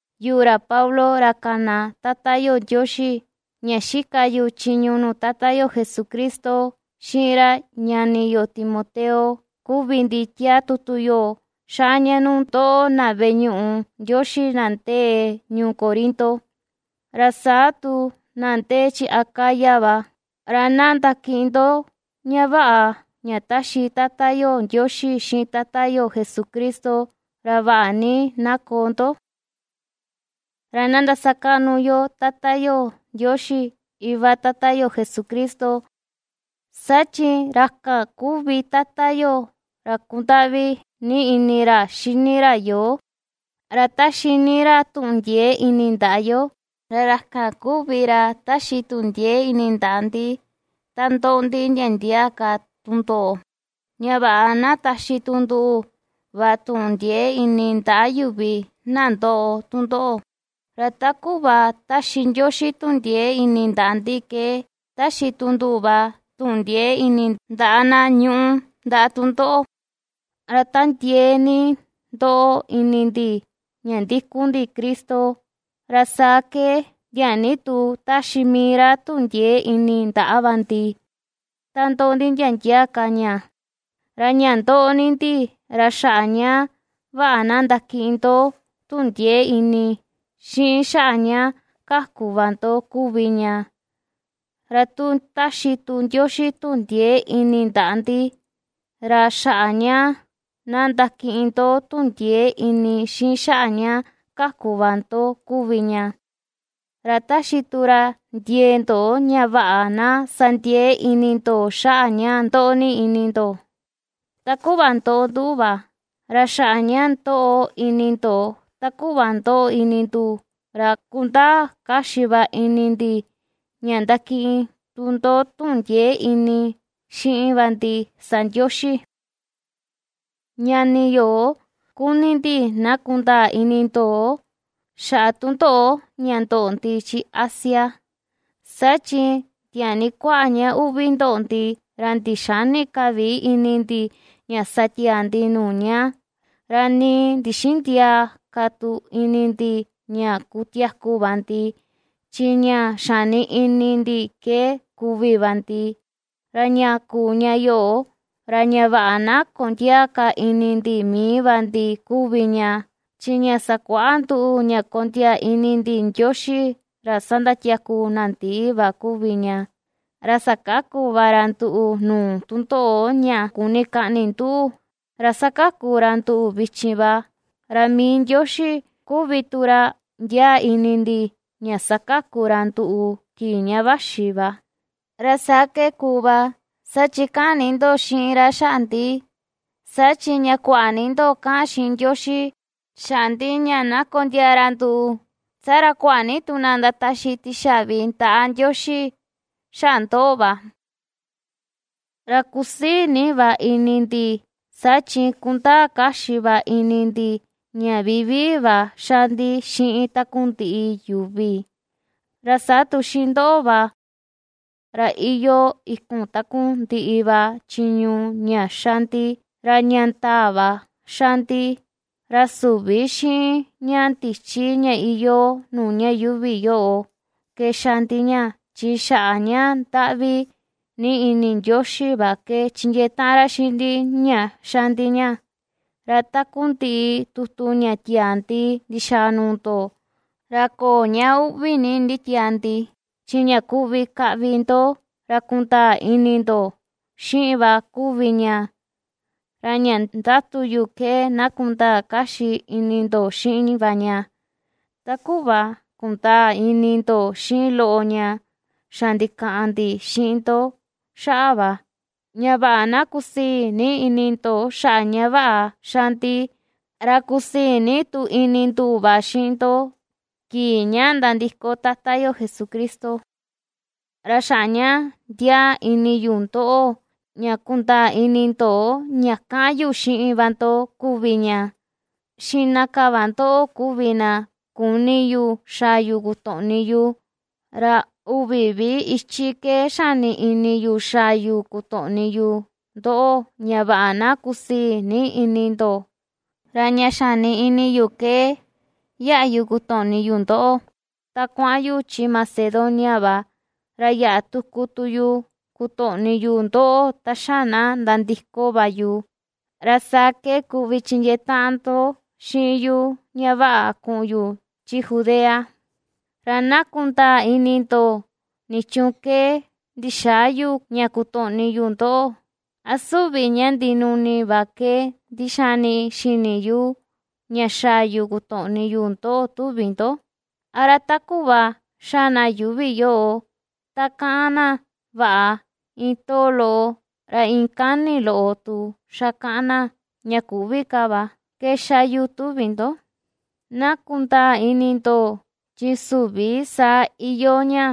Yuꞌu, ra Pablo, ra kana Tata yo Ndioxi, ña xika yu chiñu nuu Tata yo Jesucristo, xiꞌin ra ñani yo Timoteo, kuvi ndi, tiaa tutu yoꞌo xaa ña nuu ndoꞌo, na veꞌe ñuꞌu Ndioxi na ndee ñuu Corinto, ra saa tu na ndee chi Acaya va. Ra na ndakiꞌin ndo ña vaꞌa ña taxi Tata yo Ndioxi, xiꞌin Tata yo Jesucristo, ra vaꞌa ni na koo ndo. Ra na ndasakaꞌnu yo Tata yo Ndioxi Iva Tata yo Jesucristo, saa chi ra kan kuvi Tata yo, ra kundaꞌvi ni ini ra xini ra yoo, ra ^taxi ni ra tuꞌun ndiee ini ndaꞌa yo. Ra ra kan kuvi ra ^taxi tuꞌun ndiee ini ndaꞌa ndi, ta ndoꞌo ndi ndia ndia ka tundoꞌo, ña vaꞌa na taxi tu nduꞌu va tuꞌun ndiee ini ndaꞌa yuvi na ndoꞌo tundoꞌo, ra ta kuꞌva ^taxi Ndioxi tuꞌun ndiee ini ndaꞌa ndi ke ^taxi tu nduꞌu va tuꞌun ndiee ini ndaꞌa na ñuꞌu ndaꞌa tundoꞌo. Ra ta ndiee ni ndoꞌo ini ndi ña ndikun ndi Cristo, ra saa ke tiaa ni tu ^taxi mii ra tuꞌun ndiee ini ndaꞌa va ndi, ta ndoꞌo ndi ndia ndia ka ña. Ra ña ndoꞌo ni ndi, ra xaꞌa ña vaꞌa na ndakiꞌin ndoꞌo tuꞌun ndiee ini, xiꞌin xaꞌa ña kaku va ndo kuvi ña; ra tu ^taxi tu Ndioxi tuꞌun ndiee ini ndaꞌa ndi, ra xaꞌa ña na ndakiꞌin ndo tuꞌun ndiee ini, xiꞌin xaꞌa ña kaku va ndo kuvi ña, ra ^taxi tu ra ndiee ndo ña vaꞌa na sa ndiee ini ndo xaꞌa ña ndoꞌo ni ini ndo, ta kuꞌva ndoꞌo nduꞌu va. Ra xaꞌa ña ndoꞌo ini ndo ta kuꞌva ndoꞌo ini nduꞌu, ra kundaa kaxi va ini ndi, ña ndakiꞌin tu ndo tuꞌun ndiee ini xiꞌin va ndi sa Ndioxi. Ñani yo, kuni ndi na kundaa ini ndo, xaꞌa tundoꞌo ña ndoꞌo ndi chi Asia. Saa chi tiaa ni kuaꞌa ña uꞌvi ndoꞌo ndi, ra ndixäni ka vi ini ndi ña sa tiaa ndi nuu ña, ra nii ndixïndiaa ka tu ini ndi ña kutiaku va ndi. Chi ña xani ini ndi ke kuvi va ndi. Ra ña kuu ña yoꞌo, ra ña vaꞌa na kondiäa ka ini ndi mii va ndi kuvi ña, chi ña sakuaꞌa nduꞌu ña kondiaa ini ndi Ndioxi, ra ^sandatiaku na ndii va kuvi ña. Ra sakaku va ra nduꞌu nuu tundoꞌo ña kuni kaꞌni nduꞌu, ra ^sakaku ra nduꞌu vichin va, ra mii Ndioxi kuvi tu ra ndiaa ini ndi ña sakaku ra nduꞌu kii ña vaxi va. Ra saa ke kuu va, saa chi kaꞌan ni ndo xiꞌin ra xaꞌa ndi. Saa chi ña kuaꞌa ni ndo kaꞌan xiꞌin Ndioxi xaꞌa ndi ña na kondiaa ra nduꞌu, saa ra kuaꞌa ni tu na ndataxi tixaꞌvi ndaꞌa Ndioxi xaꞌa ndoꞌo va. Ra kusii ni va ini ndi, saa chi kundaa kaxi va ini ndi, ña vivii va ^xa ndi xiꞌin takundiꞌi yuvi, ra saa tu xiꞌin ndoꞌo va, ra iyoo ikun takundiꞌi va chiñu ña xa ndi, ra ña ndaa va xa ndi. Ra süvi xiꞌin ña ndichi ña iyoo nuu ña yuuvi yoꞌo ke xa ndi ña, chi xaꞌa ña ndaꞌvi ni ini Ndioxi va ke ^chindiee taꞌan ra xiꞌin ndi ña xa ndi ña. Ra takundiꞌi tutu ña tia̱à ndi ndixaa nuu ndo, ra köo ña uꞌvi ni nditiaa ndi, chi ña kuvi kaꞌvi ndo, ra kundaa ini ndo xiꞌin va kuvi ña. Ra ña ndiatu yu ke na kundaa kaxi ini ndo xiꞌin va ña, ta kuꞌva kundaa ini ndo xiꞌin loꞌo ña xa ndikaꞌan ndi xiꞌin ndo xaꞌa va. Ña vaꞌa na kusii ni ini ndo xaꞌa ña ^xa ndi, ra kusii ni tu ini nduꞌu va xiꞌin ndo, kii ña nandiko Tata yo Jesucristo. Ra xaꞌa ña ndiaa ini yu ndoꞌo ña kundaa ini ndo ña kaꞌan yu xiꞌin va ndo kuvi ña, xiꞌna ka va ndoꞌo kuvi na kuni yu xaa yu kutoꞌni yu, ra uvi vi ichi ke xani ini yu xaa yu kutoꞌni yu ndoꞌo, ña vaꞌa na kusii ni ini ndo; ra ña xani ini yu ke yaꞌa yu kutoꞌni yu ndoꞌo, ta kuaꞌan yu chi Macedonia va, ra yaꞌa tuku tu yu kutoꞌni yu ndoꞌo ta xa na nandiko va yu. Ra saa ke kuvi chindiee taꞌan ndo xiꞌin yu ña vaꞌa kuꞌun yu chi Judea. Ra na kundaa ini ndo, nichuun ke ndixäa yu ña kutoꞌni yu ndoꞌo: ¿a süvi ña ndinuni va ke ndixani xini yu ña xaa yu kotoꞌni yu ndoꞌo, tuvi ndo? ¿Ra a ta kuꞌva xa na yuuvi yoꞌo ta kaꞌan na “vaꞌa” iin too loꞌo, ra iin kani loꞌo tu xa kaꞌan na ña “küvi” ka va, ke ^xa yu, tuvi ndo? Na kundaa ini ndo, chi süvi saa iyoo ña,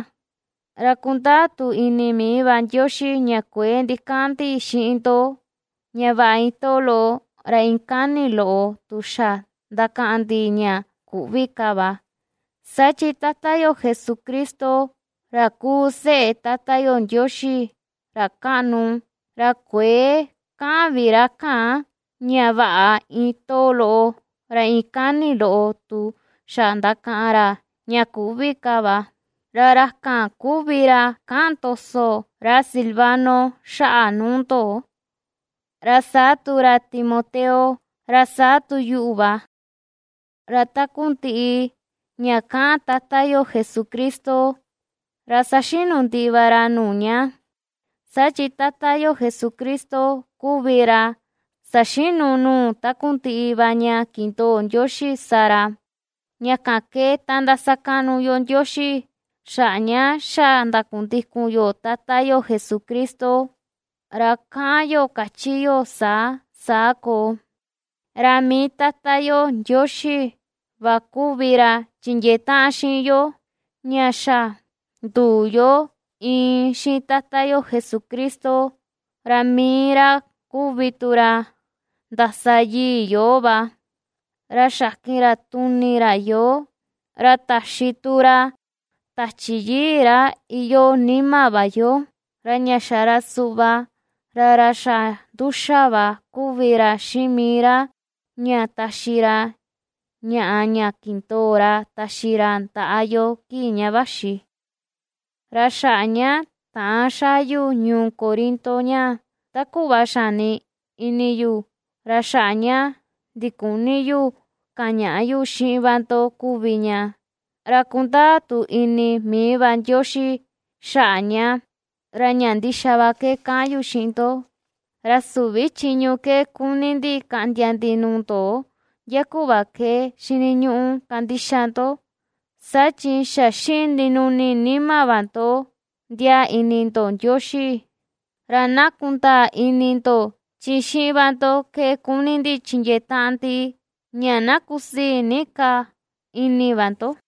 ra kundaa tu ini mii va Ndioxi ña kuëe ndikaꞌan ndi xiꞌin ndo ña “vaꞌa” iin too loꞌo, ra iin kani loꞌo tu xa ndakaꞌan ndi ña “küvi” ka va. Saa chi Tata yo Jesucristo, ra kuu seꞌe Tata yo Ndioxi, ra kaꞌnu, ra kuëe kaꞌan vi ra kan ña “vaꞌa” iin too loꞌo, ra iin kani loꞌo tu xa ndakaꞌan ra ña “küvi” ka va. Ra ra kan kuvi ra kaꞌan ndoso ra Silvano xaꞌa nuu ndo, ra saa tu ra Timoteo, ra saa tu yuꞌu va. Ra takundiꞌi ña kaꞌan Tata yo Jesucristo, ra saxinu ndiꞌi va ra nuu ña. Saa chi Tata yo Jesucristo kuvi ra saxinu nuu takundiꞌi va ña kindoo Ndioxi sa ra. Ña kan ke ta ndasakaꞌnu yo Ndioxi, xaꞌa ña xa ndakundikun yo Tata yo Jesucristo, ra kaꞌan yo, kachi yo saa, “saa koo”. Ra mii Tata yo Ndioxi va kuvi ra chindiee taꞌan xiꞌin yo ña xa nduu yo iin xiꞌin Tata yo Jesucristo, ra mii ra kuvi tu ra ndasa yii yoo va. Ra xakin ra tuni ra yoo, ra taxi tu ra Tachi Yii ra iyoo nima va yo, ra ña xa ra suꞌva ra ra xa ^nduxa va kuvi ra xiꞌin mii ra ña taxi ra ñaꞌa ña kindoo ra taxi ra ndaꞌa yo kii ña vaxi. Ra xaꞌa ña täan xaa yu ñuu Corinto ñaa ta kuꞌva xani ini yu, ra xaꞌa ña ndiküni yu kañaꞌa yu xiꞌin va ndo kuvi ña, ra kundaa tu ini mii va Ndioxi xaꞌa ña, ra ña ndixa va ke kaꞌan yu xiꞌin ndo. Ra süvi chiñu ke kuni ndi kaꞌndia ndi nuu ndo ndia kuꞌva ke xiniñuꞌu kandixa ndo, saa chi xa xiꞌin ndinuni nima va ndo ndiaa ini ndo Ndioxi; ra na kundaa ini ndo, chi xiꞌin va ndo ke kuni ndi chindiee taꞌan ndi ña na kusii ni ka ini va ndo.